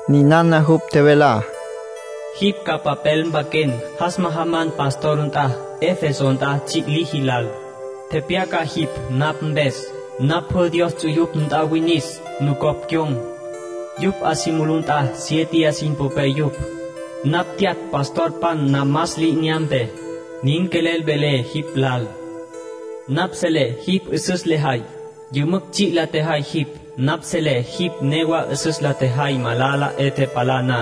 Ninana jupj tjevelá: “Jipj ca papel mpaquen, jas majaman pastor nt'a, Efeso nt'a tsji' liji lal. Tepyaca jipj napj mpes: Napj pjü Dios ts'uyupj nt'a winis, nucopj cyon̈. Yupj 'a si mulú nt'a siéteya sin popé yupj. Napj tyatj pastorpan namas li'inyampé. Nin quelel velé jipj lal: Napj selé jipj 'üsüs lejay. Yümücj tsji' la tjejay jipj. Napj selé jipj newa 'üsüs la tjejay malala 'e tepalá na.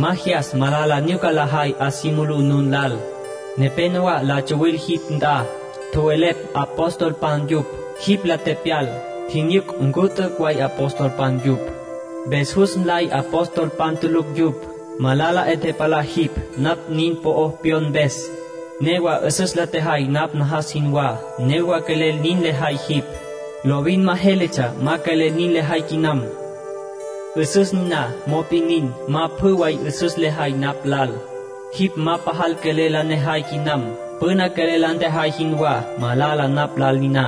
Ma jyas malala nyuca lajay 'a si mulú nun lal. Nepénowa la tsawil jipj nt'a, tjowelepj apostolpan yupj. Jipj la tepyal, tjinyuc ncu t'üc' way apostolpan yupj. Mpes jus nley apostolpan tulucj yupj. Malala 'e tepalá jipj napj nin po'o pyon mpes. Newa 'üsüs la tjejay napj najas jinwá. Newa quelel nin lejay jipj; lovin ma jéletsja ma quelel nin lejay quinam. 'Üsüs niná, mop'in nin, ma pjü way 'üsüs lejay napj lal. Jipj ma pajal quelel la nejay quinam, püna quelel la ntjejay jinwá. Malala napj lal niná.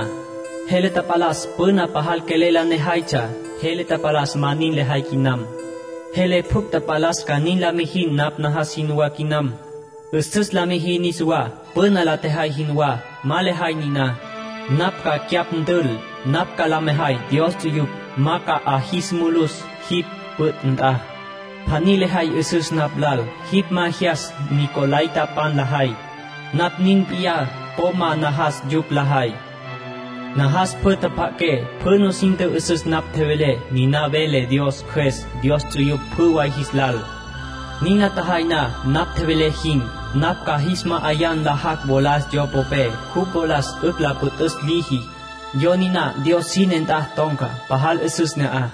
Jele tapalas püna pajal quelel la nejaytsja. Jele tapalas ma nin lejay quinam. Jele pjucj tapalas ca nin la mijin napj najas jinwá quinam. 'Üsüs la mijin niswá, püna la tjejay jinwá. Ma lejay niná, napj ca cyapj ntül. Napj ca la mejay Dios ts'uyupj ma ca 'a jis mulus jipj püt' nt'a. Pjaní lejay 'üsüs napj lal. Jipj ma jyas nicolaitapan lajay. Napj nin p'iyá, po ma najas yupj lajay. Najas pjü tjapja'aqué, pjü nusin tjü'üsüs napj tjevelé. Ninana vele Dios Cjües Dios ts'uyupj pjü way jis lal. Nin la tjajay na napj tjevelé jin, napj ca jis ma'ayá nlajacj wolas yo popé, jupj wolas 'ücj la püt'üs liji. Yo niná Dios sine nt'a ton̈ca. Pajal 'üsüs ne'aj”,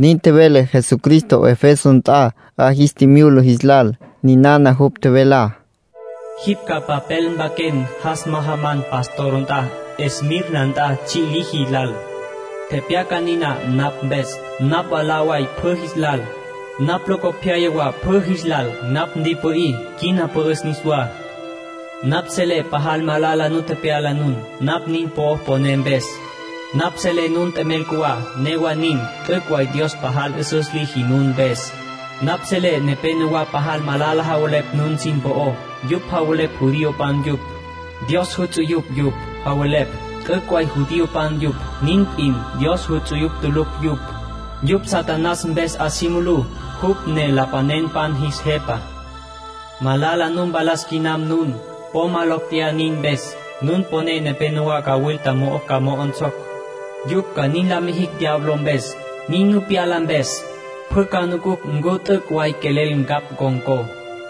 nin tjevele Jesucristo Efeso nt'a 'a jis tjimyula jis lal. Ninana jupj tjevelá: “Jipj ca papel mpaquen, jas majaman pastor nt'a Esmirna nt'a tsji' liji lal. Tepyaca niná napj mpes: Napj mwalá way pjü jis lal. Napj locopyaya wa pjü jis lal. Napj ntipü'í, quina pü'üs niswá. Napj selé pajal malala nu tepyala nun, napj nin po'ó poné mpes. Napj selé nun t'emel cjuwá; newa nin, t'üc' way Dios pajal 'üsüs liji nun mpes. Napj selé nepénowa pajal malala javelepj nun sin po'ó. Yupj javelepj judiopan yupj; Dios juts'uyupj yupj, javelepj. T'üc' way judiopan yupj, nin p'in; Dios juts'uyupj tulucj yupj. Yupj Satanás mpes 'a si mulú, jupj ne lapanenpan jis jepa. Malala nu mpalas quinam nun; po ma locj tjeyá nin mpes. Nun popé nepénowa cawilta mo'o ca mo'onsocj. Yupj ca nin la mijicj diablo mpes. Nin nu pyala mpes, pjü ca nucucj ncu t'üc' way quelel ncapj con̈có.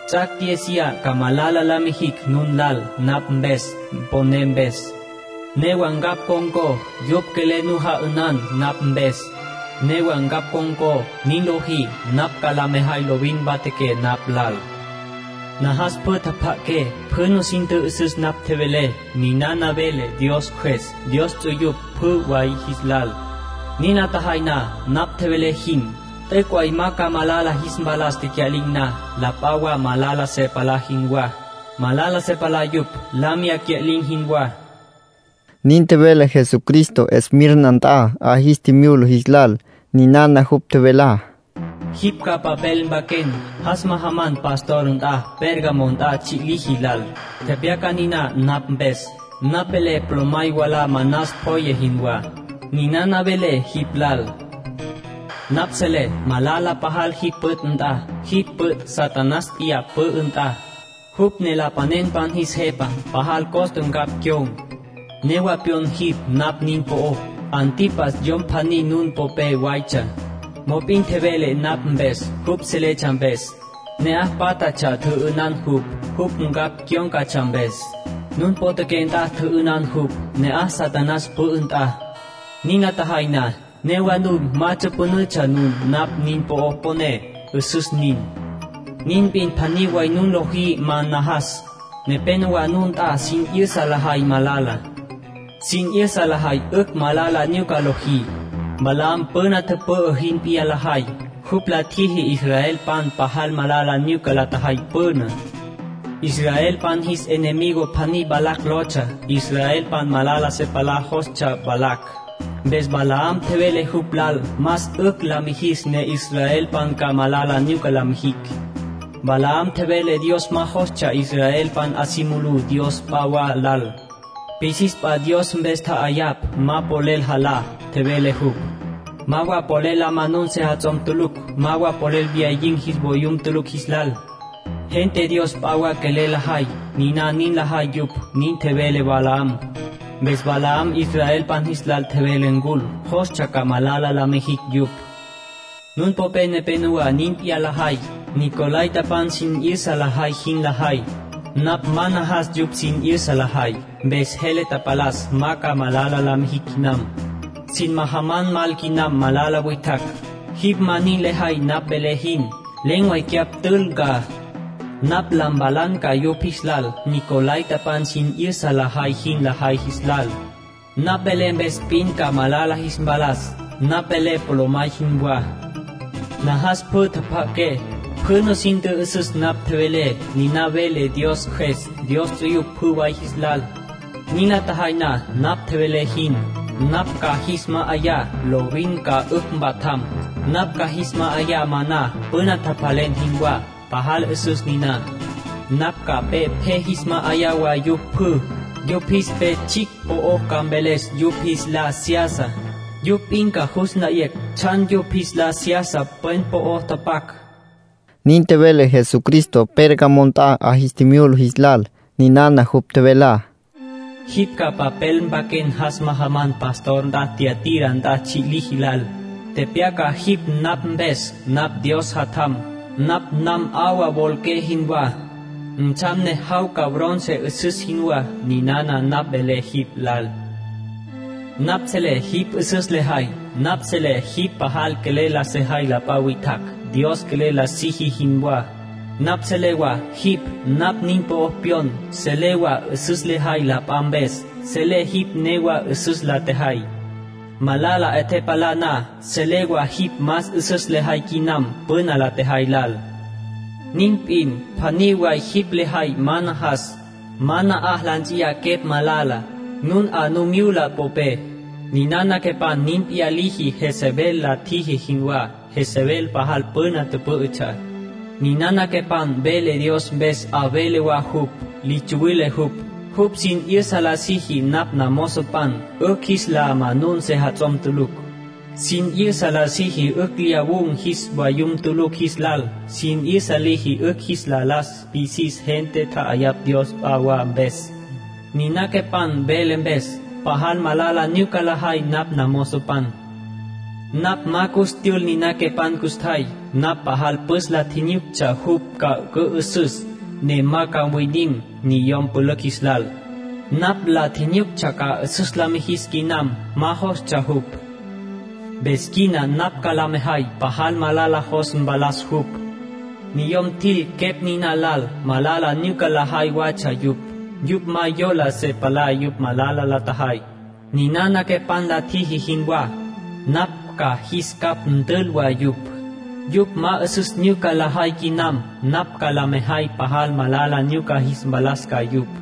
Ts'ac' diéziya ca malala la mijicj nun lal napj mpes poné mpes. Newa ncapj ncon̈có. Yupj quelel nu ja'ünan napj mpes, newa ncapj ncon̈có. Nin lojí, napj ca la mejay lovin mpatjaqué napj lal. Najas pjü tjapja'aqué, pjü nusin tjü'üsüs napj tjevelé. Ninana vele Dios Cjües Dios ts'uyupj pjü way jis lal. Nin la tjajay na napj tjevelé jin, t'üc' way ma ca malala jis mpalas tecya'lin̈ na, la p'a wa malala se palá jinwá. Malala se palá yupj, la miyá cya'lin̈ jinwá”, nin tjevele Jesucristo Esmirna nt'a 'a jis tjimyula jis lal. Ninana jupj tjevelá: “Jipj ca papel mpaquen, jas majaman pastor nt'a Pérgamo nt'a tsji' liji lal. Tepyaca niná napj mpes: Napj velé polomay wala manas pjoye jinwá. Ninana velé jipj lal. Napj selé malala pajal jipj püt' nt'a. Jipj püt' Satanás p'iyá pü'ü nt'a, jupj ne lapanenpan jis jepa. Pajal costa ncapj cyon̈, newa pyon jipj napj nin po'ó. Antipas yom pjaní nun popé watsja. Mop'in tjevele napj mpes, jupj seletsja mpes. Ne'aj pátjatsja tjü'ünan jupj, jupj ncapj cyón̈catsja mpes. Nun potjaqué nt'a tjü'ünan jupj, ne'aj Satanás pü'ü nt'a. Nin la tjajay na, newa nun ma tsüpünütsja nun napj nin po'ó poné. 'Üsüs nin. Nin p'in pjaní way nun lojí ma najas. Nepénowa nun nt'a sin 'yüsa lajay malala. Sin 'yüsa lajay 'ücj malala nyuca lojí. Balaam püna tüpü'ü jin p'iyá lajay. Jupj la tjiji israelpan pajal malala nyuca la tjajay püná. Israelpan jis enemigo pjaní Balac lotsja. Israelpan malala se palá jostsja Balac. Mpes Balaam tjevele jupj lal más 'ücj la mijis ne israelpan ca malala nyuca la mijicj. Balaam tjevele Dios ma jostsja israelpan 'a si mulú dios p'a wa lal. Pisis p'a dios mpes tja'ayapj ma polel jalá, tjevele jupj. Ma wa polel la manun sejats'om tulucj, ma wa polel lyawun̈ jis vayum tulucj jis lal. Gente dios p'a wa quelel lajay, niná nin lajay yupj, nin tjevele Balaam. Mpes Balac israelpan jis lal tjevele ncul; jostsja ca malala la mijicj yupj. Nun popé nepenowá nin p'iyá lajay. Nicolaitapan sin 'yüsa lajay jin lajay. Napj ma najas yupj sin 'yüsa lajay. Mpes jele tapalas ma ca malala la mijin quinam. Sin majaman mal quinam malala witjacj. Jipj ma nin lejay napj velé jin, len̈ way cyapj ntül ca. Napj la mpalan ca yupj jis lal, nicolaitapan sin 'yüsa lajay jin lajay jis lal. Napj velé mpes p'in ca malala jis mpalas. Napj velé polomay jinwá. Najas pjü tjapja'aqué, pjü nusin tjü'üsüs napj tjevelé. Ninana vele Dios Cjües Dios ts'uyupj pjü way jis lal. Nin la tjajay na napj tjevelé jin, napj ca jis ma'ayá lovin ca 'ücj mpatjam. Napj ca jis ma'ayá maná püna tjapjalen jinwá, pajal 'üsüs niná. Napj ca pe pje jis ma'ayá wa yupj pjü. Yupj jis pe tsjicj po'o ca mveles yupj jis lá seyasa. Yupj p'in ca jus nlayecj tsjan yupj jis lá seyasa pwen po'o tepyac”, nin tjevele Jesucristo Pérgamo nt'a 'a jis tjimyula jis lal. Ninana jupj tjevelá: “Jipj ca papel mpaquen, jas majaman pastor nt'a Tiatira nt'a tsji' liji lal. Tepyaca jipj napj mpes: Napj Dios Jatjam. Napj nan 'awa wolaqué jinwá. Ntsjam ne jawca bronce 'üsüs jinwá. Ninana napj velé jipj lal: Napj selé jipj 'üsüs lejay. Napj selé jipj pajal quelel la sejay la p'a witjacj, Dios quelel la siji jinwá. Napj selé wa jipj napj nin po'ó pyon. Selé wa 'üsüs lejay la p'a mpes. Selé jipj newa 'üsüs la tjejay, malala 'e tepalá na. Selé wa jipj más 'üsüs lejay quinam püna la tjejay lal. Nin p'in pjaní way jipj lejay ma najas. Ma na'aj la ts'in quepj malala, nun 'a nu myula popé. Ninana quepan nin p'iyá liji Jezebel la tjiji jinwá, Jezebel pajal püna tüpǘ'ütsja. Ninana quepan vele Dios mpes 'a vele wa jupj. Li tsuwile jupj. Jupj sin 'yüsa la siji napj namozopan 'ücj jis la manun sejats'om tulucj; sin 'yüsa la siji 'ücj lyawun̈ jis vayum tulucj jis lal. Sin 'yüsa liji 'ücj jis la las pisis gente tja'ayapj dios p'a wa mpes. Niná quepan vele mpes, pajal malala nyuca lajay napj namozopan. Napj ma cus tyül niná quepan custjay. Napj pajal püs la tjinyuctsja jupj ca cü'ü'süs, ne ma ca mwinim niyom pülücj jis lal. Napj la tjinyuctsja ca 'üsüs la mijis quinam. Ma jostsja jupj. Mpes quina napj ca la mejay pajal malala jos mpalas jupj. Niyom tjil quepj niná lal, malala nyuca lajay watsja yupj. Yupj ma yola se palá yupj malala la tjajay, ninana quepan la tjiji jinwá, napj ca jis capj ntül wa yupj. Yupj ma 'üsüs nyuca lajay quinam, napj ca la mejay pajal malala nyuca jis mpalas ca yupj.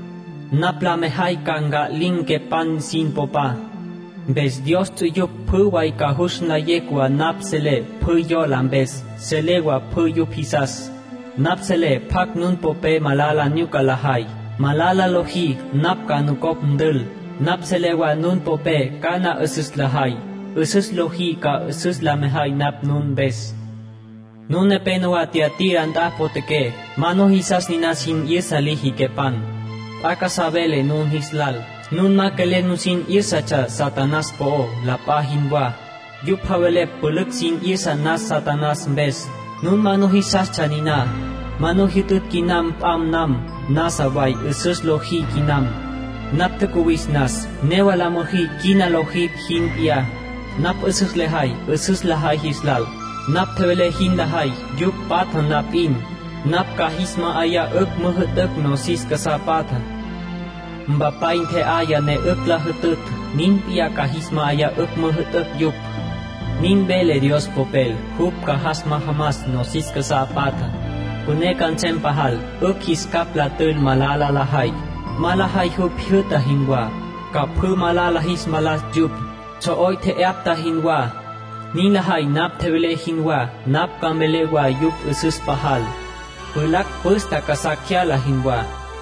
Napj la mejay ca nca'lin̈ quepan sin popa. Mpes Dios ts'uyupj pjü way ca jus nlayecj wa napj selé pjü yola mpes, selé wa pjü yupj jisas. Napj selé pjacj nun popé malala nyuca lajay. Malala lojí, napj ca nucopj ntül. Napj selé wa nun popé cana 'üsüs lajay. 'Üsüs lojí, ca 'üsüs la mejay napj nun mpes. Nun nepénowa Tiatira nt'a potjaqué, ma nujisas niná sin 'yüsa liji quepan. P'a casá velé nun jis lal. Nun ma quelel nusin 'yǘsatsja Satanás po'ó, la p'a jinwá. Yupj javelepj pülücj sin 'yüsa nas Satanás mpes. Nun ma nujisastsja niná, ma nu jyütütj quinam p'am nam. Nasa way 'üsüs lojí quinam. Napj tjacuwis nas, newa la müjí quina lojí jin p'iyá. Napj 'üsüs lejay 'üsüs lajay jis lal. Napj tjevelé jin la jay yupj patja na p'in, napj ca jis ma'ayá 'ücj müjü'tücj nosis casá patjá. Mpapay ntje'aya ne 'ücj la jütütj. Nin p'iyá ca jis ma'ayá 'ücj müjü'tücj yupj. Nin vele Dios Popel: ‘Jupj ca majamas nosis casá patjá. Püné ca nsem pajal, 'ücj jis capj la tül malala lajay. Ma lajay jupj jyü'ta jinwá, ca pjü malala jis mpalas yupj, tsjo'oy tje'yapta jinwá.’ Nin lajay napj tjevelé jinwá, napj ca mvelé wa yupj 'üsüs pajal, pjulacj püstapj casá cyala jinwá.